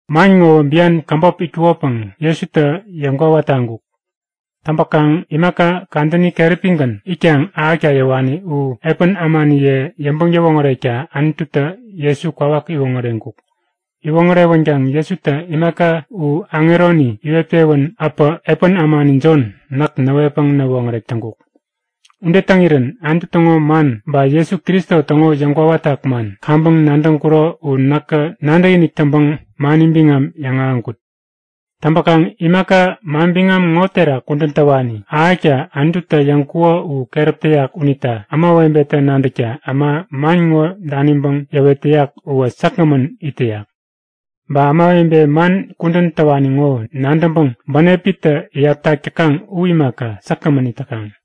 Man ŋowä bian käbop itkukopäŋ Jesutä yäŋkwawa taŋkuk. Täŋpäkaŋ imaka kadäni keräpigän itkaŋ ahäkta yäwani u epän ämaniye yäŋpäŋ-yäwoŋärekta Anututä Jesu kwawak iwoŋäreŋkuk. Iwoŋärewänkaŋ Jesutä imaka u aŋeroni iwet-pewän äpä epän ämani Jon näk näwetpäŋ näwoŋärek täŋkuk. Ude täŋirän Anutu täŋo man ba Jesu Kristo täŋo yäŋkwawatak man kaŋpäŋ nadäŋkuro u näkä nadäkinik täŋpäŋ mani biŋam yäŋahäŋkut. Täŋpäkaŋ imaka manbiŋam ŋo terak kudän täwani ahäkta Anututä yäŋkuko u keräp täyak unita ämawebetä nadäkta äma man ŋo daniŋpäŋ yäwet täyak uwä säkgämän it täyak. Ba ämawebe man kudän täwani ŋo nadäŋpäŋ bänepitä iyaptak täkaŋ u imaka, säkgämän it täkaŋ.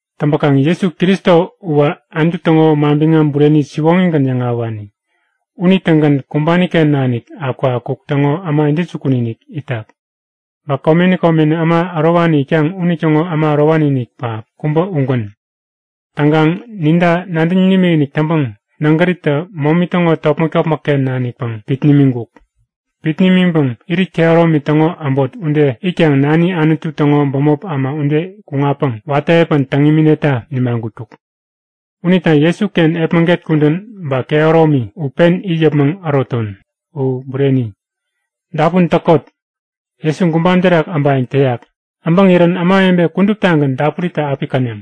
Täŋpäkaŋ Jesu Kristo uwä Anutu täŋo manbiŋam bureni siwoŋigän yäŋahäwani. Unitägän kumbani-ken nanik akukakuk täŋo äma intäjukun-inik itak. Ba komeni komeni äma ärowani itkaŋ unitäŋo äma ärowani-inik pähap kubä ugän. Täŋkaŋ ninta nadäŋ nimikinik täŋpäŋ nägäritä momi täŋo topmäk-topmäkken nanikpäŋ pit nimiŋkuk. Pit nimiŋpäŋ irit kehäromi täŋo äbot ude itkaŋ nani Anutu täŋo bämop äma ude kuŋatpäŋ watä epän täŋ imineta nipmaŋkuk. Unita Jesuken epmäget kudän ba kehäromi u pen it yäpmäŋ äroton! U bureni. Dapun täkot! Jesu gubam terak äbayäŋ täyak! Äbäŋirän ämawebe kuduptagän dapuritä api käneŋ.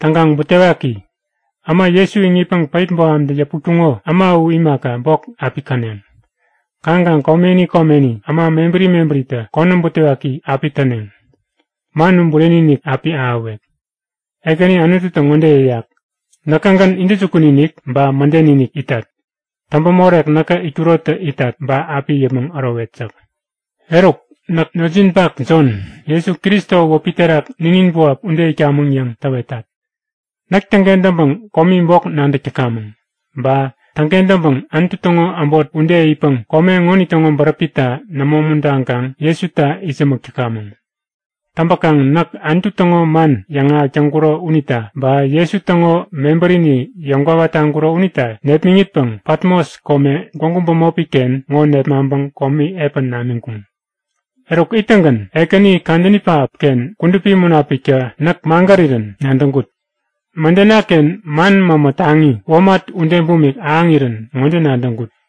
Täŋkaŋ butewaki! Äma Jesu iŋitpäŋ päip bohamtä yäputkuŋo, äma u imaka bok api käneŋ. Kaŋkaŋ komeni komeni äma mebäri mebäritä konäm butewaki api täneŋ. Man u bureni-inik api ahäwek! Ekäni Anututä ŋode yäyak; Näkägän intäjukun-inik ba mäden-inik itat. Täŋpämorek näkä itkurotä itat ba api it yäpmäŋ ärowet yäk. Eruk, näk notjinpak Jon, Jesu Kristo wäpi terak ninin buap ude itkamäŋ yäŋ täwetat. Näk täŋkentäŋpäŋ komi bok nadäk täkamäŋ. Ba täŋkentäŋpäŋ Anutu täŋo äbot ude itpäŋ kome ŋonitäŋo bäräpita nämo umuntaŋkaŋ Jesuta itsämäk täkamäŋ. Täŋpäkaŋ näk Anutu täŋo man yäŋahäk täŋkuro unita ba, Jesu täŋo mebärini yäŋkwawa taŋkuro unita nepmäŋitpäŋ Patmos kome gwägu bämopi-ken ŋo nepmaŋpäŋ komi epän namiŋkuŋ. Eruk ittäŋgän Ekäni kadäni pähapken Kudupi Munapiktä näk magärirän nadäŋkut. Mädenaken man mämä taŋi, womat ude bumik ahäŋirän ŋode nadäŋkut;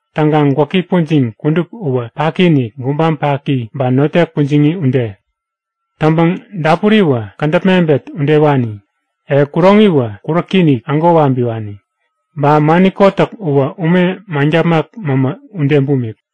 Täŋkaŋ gwäki pujiŋ kudup uwä paki-inik, gubam paki, ba notek pujiŋi ude. Täŋpäŋ dapuriwä kädäp mebet udewani. E, kuroŋiwä kuräki-inik, ägo wabiwani. Ba mani kotäk uwä ume maŋtapmak mämä ude bumik.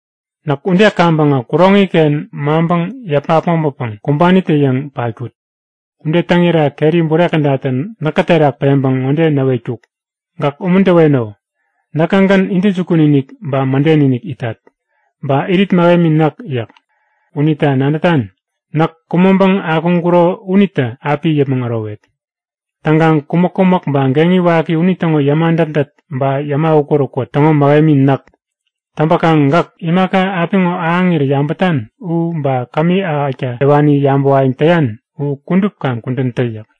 Näk ude kaŋpäŋä kuroŋi-ken maŋpäŋ yäpa äpmoŋpäpäŋ kumbanitä-yäŋ patkut. Ude täŋira keri bure kädatä näkä terak peŋpäŋ ŋode näwetkuk; Gäk umuntäweno. Näkägän intäjukun-inik ba mäden-inik itat. Ba irit mähemi näk yäk. Unita nadätan? Näk kumäŋpäŋ akuŋkuro unitä api it yäpmäŋ ärowet. Täŋkaŋ kumäk-kumäk ba geŋi waki unitäŋo yäma dätdät ba yäma ukät-ukät täŋo mähemi näk. Täŋpäkaŋ gäk imaka apiŋo ahäŋirä yabätan u, ba kämi ahäkta yäwani yabäwayäŋ täyan u kudup kaŋ kudän tä yäk.